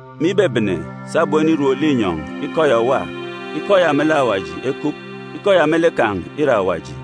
Me ibebene, sabum enirom linyọn̄, Ikọ ya òwa. Ikọ ya melek Awaji ekup. Ikọ ya me lek kan̄ ìre Awaji.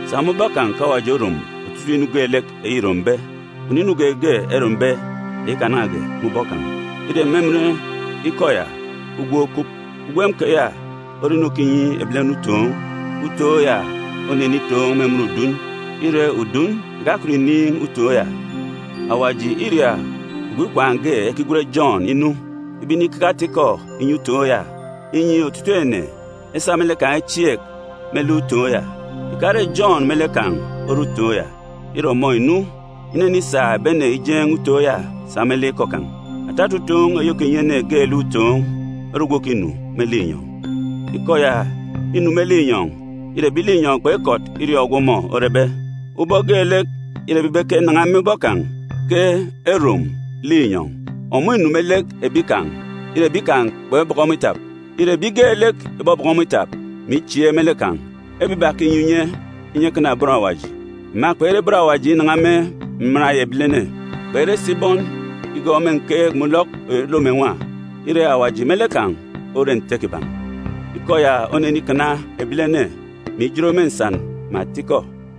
Sa me ubọk kan̄ ke Awaji orom otutuuk inu geelek eyi îrombe. Kpunu inu geege erombe eyi ikanan̄age me ubọk kan̄. Îre me emen Ikọ ya ke ugwem okup. Ugwem keya ore inu òkinyi ebilene utoon̄. Utoon̄ ya onenitoon̄ me emen udun, ire, udun ìkakọt ìniin̄ utoon̄ ya. Awaji îria ogwu ikwaan̄ ge, ekigwen Jọn, inu, ibe inikeke ata-ikọ inyi utoon̄ ya, inyi otutuuk ene esa me lek kan̄ echieek me lek utoon̄ ya. Ìkare Jọn me lek kan̄ ore utoon̄ ya. Ire, ọmọ ìnu inenisa ebi ene ijeen̄ utoon̄ ya sa me lek ikọ kan̄. Atata utoon̄ eyi òkinyi ene geelek utoon̄, ore ogwu òkinu me linyọn̄. Ikọ ya înu me linyọn̄. Ire, ebi linyọn̄ kpekọt iriọọn̄ ogwu ọmọ orebe, ubọk geelek îrebe ibe ke nan̄a me ubọk kan̄ ke erom linyọn̄. Ọmọ ìnu me lek ebi kan̄, ire, ebi kan̄ kpebọkọ ọmọ itap. Ire, ebi geelek ìbọbọkọ ọmọ itap, mè ichieek me lek kan̄, ebiba ke înyi unye, inyi ekana bọn Awaji. Ema kpere bọn Awaji inan̄a me mman eyi ebilene. Kpere si bọn igọọk me nkeek mè ulọk eyi olom mè nwa. Ire, Awaji me lek kan̄ ore Nte kiban̄. Ikọ ya onenikana ebilene, mè ijot me atata nnwọn mè atikọ,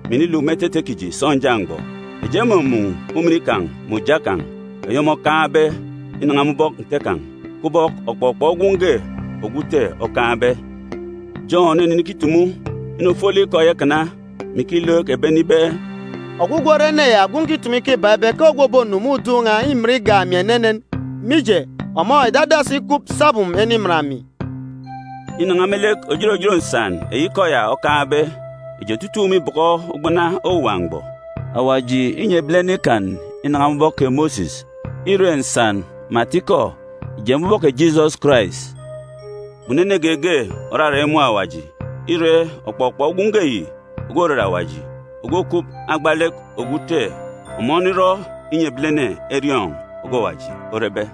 mè iniluk me etete kiji sọnja mgbọ. Eji emumun̄ ujamgbugbo kan̄ eyi ọmọ okaan̄be inan̄a me ubọk Nte kan̄, kubọk ọkpọkpọ Gwun̄ ge ogwu Ute okaan̄be. Jọn onenikitumu inu ofolek Ikọ ya ikana, mè ikilook ebi ene ibe, “Ogwugwu ore ene ya ogwu nkitumu ikọ ibak ibe ke ogwu òbonu me udun̄ n̄a îmin igak emi enenen, mije, ọmọ ìdadasi ikup sabum eniman emi.” Inan̄a me lek òjot òjot atata nnwọn eyi Ikọ ya okaan̄be, eji otutuuk mîbọkọ ugbana owuwa mgbọ. Awaji ìnyi ebilene Ikan inan̄a me ubọk kè Mosis, ire, atata nnwọn mè atikọ ìje me ubọk kè Jisọs Karais. Kpunu ene geege òrarak imun̄ Awaji. Ire, ọkpọkpọ Gwun̄ ge yi ogwu òrere Awaji, ogwu òkup me agba lek ogwu Ute, ọmọ onirọ inyi ebilene eriọọn̄ ogwu Awaji orebe.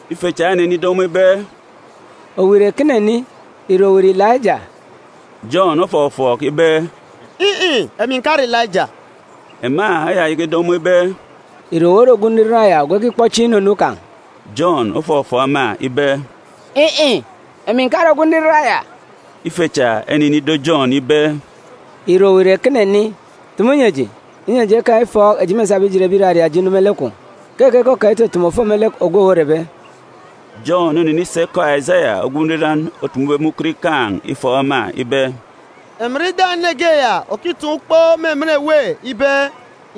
Ife cha enenido ọmọ ibe, “Owu ìre ekene ni? Ìre owu ìre Ilaijaa?” Jọn ofọfọọk ibe, “In̄-in̄, emi ǹkare Ilaija.” Ema eyayaka ido ọmọ ibe, “Ìre owu ore ogwu Nriran yab ogwu ekikpọ chieen̄ inunu kan̄?” Jọn ofọfọọk ema ibe, “In̄-in̄, emi ǹkare ogwu Nriran ya.” Ife cha enenido Jọn ibe, “Ìre owu ìre ekene ni? Tumu nyi eji, inyi eji ekaan̄ ufọọk-otu eji mêsabe ijet ebi ìraria eji inu me lek kwun̄. Keke ke okaan̄ itutumu òfo me lek ogwu owu orebe?” Jọn onenisa ikọ Asaya ogwu nriran otumube me ukot ikaan̄ ufọọk-otu ema ibe, “Emi nre ida ene ge ya òkitaan̄ ukpo me emen èwê ibe,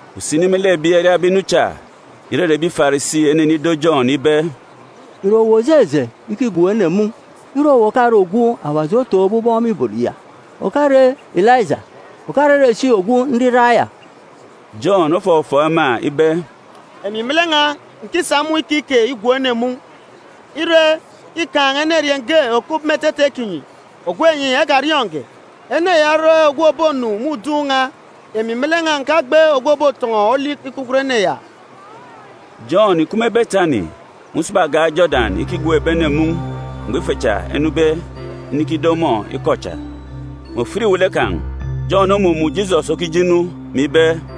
Usini me lek ebi eriabe inu cha, ìrere ebi Farisi enenido Jọn ibe, “Ìre owu òjeje ikigwook ene mun̄, ire owu òkare ogwu Awaji otọkọbe aran̄ me ibot ya, òkare Ilaija, òkarere si ogwu Nriran ya?” Jọn ofọfọọk ema ibe, “Emi me lek n̄a ǹkisa mun̄ ikike igwook ene mun̄. Ire, îkaan̄ enerieen̄ ge òkup me etete kinyi, ogwu enyi ekariọọn̄ge. Ene ya ore ogwu òbonu me udun̄ n̄a. Emi me lek n̄a ǹkagbe ogwu òbotọn̄ọ olik ikpukot ene ya.” Jọn ìkup me Betani, me usaba agan̄ Jodan ikigwook ebi ene mun̄ mgbọ ife cha enube inikido ọmọ ikọ cha. Me ofit iwele kan̄, Jọn omumun̄ Jisọs okije inu, mè ibe,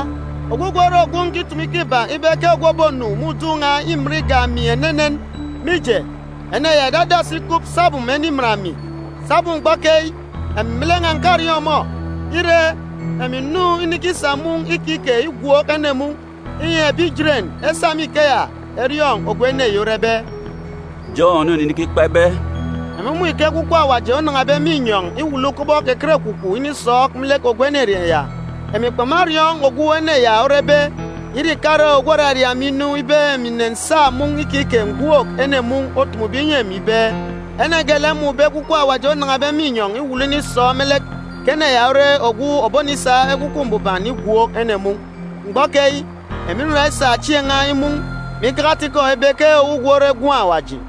Ogwugwu ore ogwu nkitumu ikọ ibak ibe ke ogwu òbonu me udun̄ n̄a îmin igak emi enenen, mije, ene ya ìdadasi ikup sabum eniman emi. Sabum mgbọ keyi, emi me lek n̄a ǹkariọọn̄ ọmọ. Ire, emi ǹnu inikisa mun̄ ikike igwook ene mun̄, inyi ebi Ijeren esa me ikeya eriọọn̄ ogwu ene yi orebe.” Jọn onenikikpa ibe, “Emi mmun̄ ike Ekwukwu Awaji onan̄abe me inyọn̄ iwulu kubọk ekerekwukwu inisọọk me lek ogwu enerieen̄ ya. Emi kpamariọọn̄ ogwu ene ya orebe, ire ìkare ogwu òraria emi inu, ibe emi ǹnensa mun̄ ikike ǹgwook ene mun̄, otumube inyi emi ibe, ene geelek mmun̄be Ekwukwu Awaji onan̄abe me inyọn̄ iwulu inisọọk me lek, ke ene ya ore ogwu òbonisa Ekwukwu Mbuban igwook ene mun̄. Mgbọ keyi, emi nra isa chieen̄ n̄a imun̄, mè ikeke ata-ikọ ibe ke ogwugwu ore Gwun̄ Awaji.”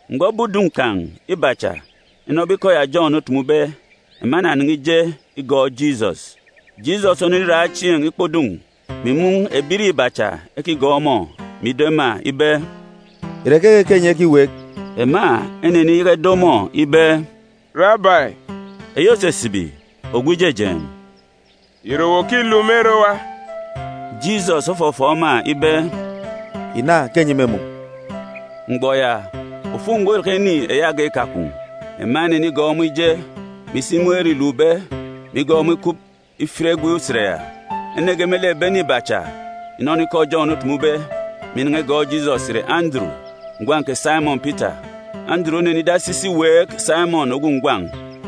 Mgbọ ebi udun̄ kan̄ iba cha enọbe ikọ ya Jọn otumube, ema enanan̄a ije igọọk Jisọs. Jisọs oneniraan̄ chieen̄ ikpọ udun̄, mè imun̄ ebirieen̄ iba cha ekigọọk ọmọ, mè ido ema ibe, “Ìre keke ke enyi ekiweek?” Ema eneniyaka ido ọmọ ibe, “Rabai (eyi òsisibi Ogwu Ijejeen̄), ìre owu òkiluk me ere owa?” Jisọs ofọfọọk ema ibe, “Ìna ke enyi mêmun̄.” Mgbọ ya, ofuk mgbọ îraka ini eyi agan̄ ikakwun̄. Ema enenigọọk ọmọ ije, mè isi imun̄ ere îlukbe, mè igọọk ọmọ ikup ifit egwe usen ya. Ene ge me lek ebi ene iba cha ìnọnọ ikọ Jọn otumube, mè inan̄a igọọk Jisọs ìre Anduru, ngwan̄ kè Saimọn Pita. Anduru onenidasi isi iweek Saimọn ogwu ngwan̄,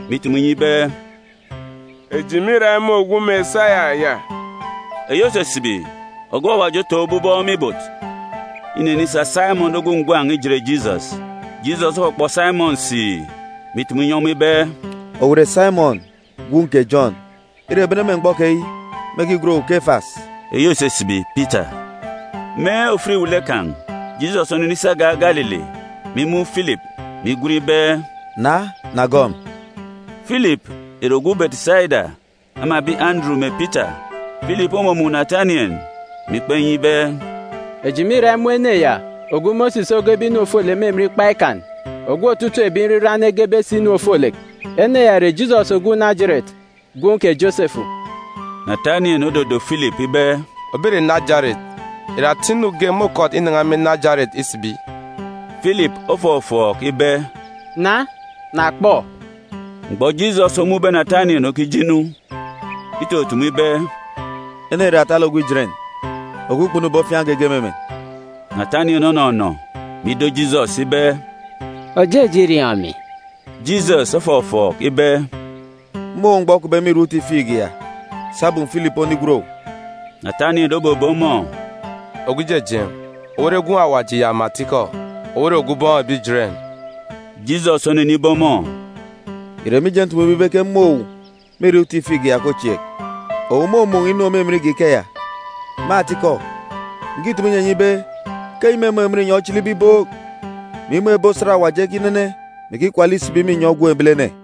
mè itumu inyi ibe, “Eji mîra imun̄ ogwu Mesaya (eyi òsisibi ogwu Awaji otọkọbe aran̄ me ibot) ya.” Inenisa Saimọn ogwu ngwan̄ ijet Jisọs. Jisọs okpọkpọ Saimọn siì, mè itumu inyi ọmọ ibe, “Owu ìre Saimọn, gwun̄ kè Jọn. Ire, bene me mgbọ keyi, mêkigwen owu Kefas (eyi òsisibi Pitae).” Me ofit iwele kan̄, Jisọs onenisi agan̄ Galili, mè imun̄ Filip, mè igwen ibe, “Na, na gọọk emi.” Filip ìre ogwu Betisaida, ama ebi Anduru mè Pita. Filip omumun̄ Natanien, mè ikpa inyi ibe, “Eji mîra imun̄ ene ya ogwu Mosis ogebe inu ofolek me emen Ikpa Ikan, ogwu otutuuk ebi nriran egebe si inu ofolek. Ene ya ìre Jisọs ogwu Najeret, gwun̄ kè Josefu.” Natanien ododo Filip ibe, “Òbe ìre Najeret? Ìre ata inu ge môkọt inan̄a me Najeret isibi?” Filip ofọfọọk ibe, “Na, na kpọ!” Mgbọ Jisọs omun̄be Natanien okije inu, itutumu ibe, “Ene yi ìre atalek ogwu Ijeren, ogwu kpunube ofiaan̄ geege me emen.” Natanien onọnọ, mè ido Jisọs ibe, “Òjeje iriọọn̄ emi?” Jisọs ofọfọọk ibe, “Mmun̄ owu mgbọ okupbe me irak uti figi ya, sabum Filip onigwen owu.” Natanien obebe ọmọ, “Ogwu Ijejeen̄, owu ore Gwun̄ Awaji ya me atikọ! Owu ore Ogwu Ubọọn̄ ebi Ijeren!” Jisọs onenibe ọmọ, “Ìre mije ntumube ibe ke mmun̄ owu me irak uti figi ya ke ochieek? Owu mômun̄ inu òmimin igak ikeya. Me atikọ, ǹkitumu inyi enyi ibe ke enyi mêmun̄ emen inyọn̄ ochilibe ibook, mè imun̄ ebi osat Awaji ekinene, mè ikikwala isibi me inyọn̄ Gwun̄ Ebilene.”